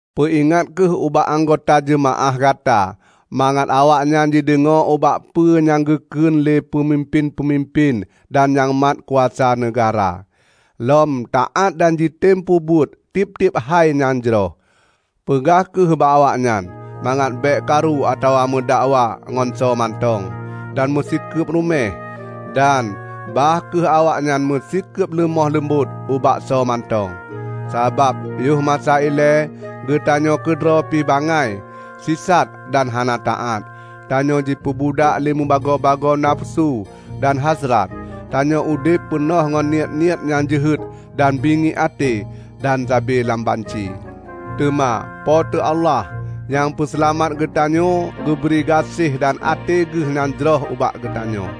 Peuingat kheueh ubak anggota jeumaáh gata mangat awaknyan jideungoe ubak peue nyang geukheun lé peumimpén-peumimpén dan nyang mat kuasa neugahra, lom taát dan jitem peubuet tieb-tieb hai nyang jroh. Peugah kheueh bak awaknyan mangat bék karu atawa meudakwa ngon soe mantong, dan meusikeub rumeh. Dan bah kheueh awaknyan meusikeub leumoh leumbot ubak soe mantong. Sabab yoh masa ilée geutanyoe keudroe pi bangai, sisat dan hana taát. Tanyoe jipeubudak lé mubagoe-bagoe nafeusu dan hasrat; tanyoe udeb peunoh ngon niet-niet nyang jeuhet dan bingiek até, dan sabe lam banci. Teuma Po teu Allah, Nyang Peuseulamat geuteunyoe geubri gaséh dan até geuh nyang jroh ubak geutanyoe.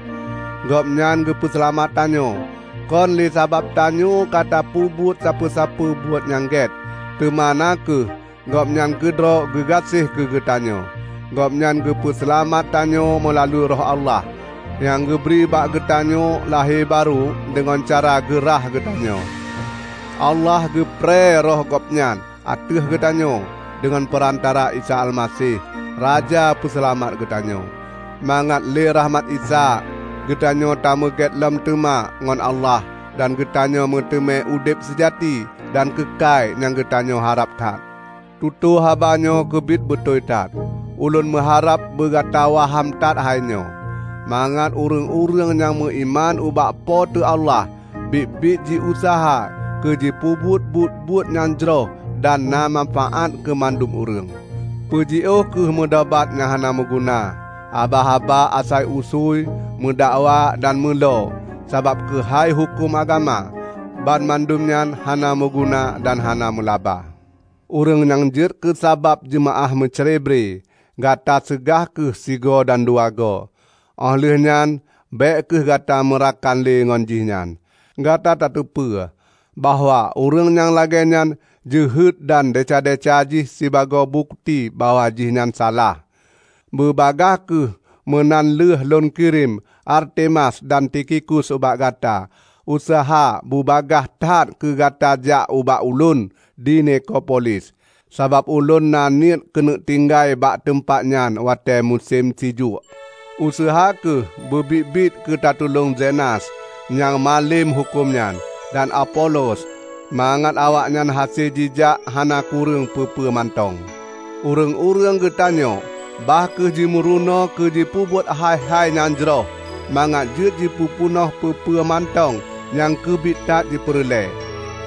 Gobnyan geupeu seulamat tanyoe, kon lé sabab tanyoe ka tapeubuet sapeue-peue buet nyang gét, teuma na kheueh Gobnyan keudroe keugeunaséh keu geutanyoe. Gobnyan geupeu seulamat tanyoe meulalu Roh Allah, nyang geubri bak geutanyoe lahé barô deungon cara geurhah geutanyoe. Allah geuprée Roh Gobnyan ateueh geutanyoe deungon peurantara Isa Almaseh, Raja Peuseulamat geutanyoe, mangat lé rahmat Isa, geutanyoe tameugét lom teuma ngon Allah dan geutanyoe meuteumé udeb seujati dan keukai nyang geutanyoe harab that. Tutoe haba nyoe keubiet beutôi that. Ulôn meuharab beu gata waham that hai nyoe, mangat ureuëng-ureuëng nyang meuiman ubak Po teu Allah biet-biet jiuseuha keu jipeubuet buet-buet nyang jroh dan na manfaát keu mandum ureuëng. Peujiôh kheueh meudobat nyang hana meuguna, haba-haba asai usui, meudakwa dan meulo sabab keuhai huköm agama. Banmandum nyan hana meuguna dan hana meulaba. Ureuëng nyang jeuet keusabab jeumaáh meucrebre, gata seugah kheueh sigoe dan dua goe; óh lheueh nyan bék kheueh gata meurakan lé ngon jih nyan. Gata tateupeue bahwa ureuëng nyang lagée nyan jeuhet dan desya-desya jih sibagoe bukeuti bahwa jihnyan salah. Beubagaih kheueh meunan lheueh lôn kirém Artemas dan Tikhikus ubak gata, useuha bubagaih that keu gata jak ubak ulôn di Nikopolis, sabab ulôn na niet keuneuk tinggai bak teumpat nyan watée musém sijuek. Useuha kheueh beubiet-biet keu tatulông Zenas, nyang malem huköm nyan, dan Apolos, mangat awaknyan hase jijak hana kureueng peue-peue mantong. Ureuëng-ureuëng geutanyoe bah kheueh jimeurunoe keu jipeubuet hai-hai nyang jroh mangat jeuet jipeupeunoh peue-peue mantong nyang keubiet that jipeureulée;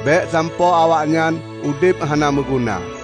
bék sampoe awaknyan udeb hana meuguna.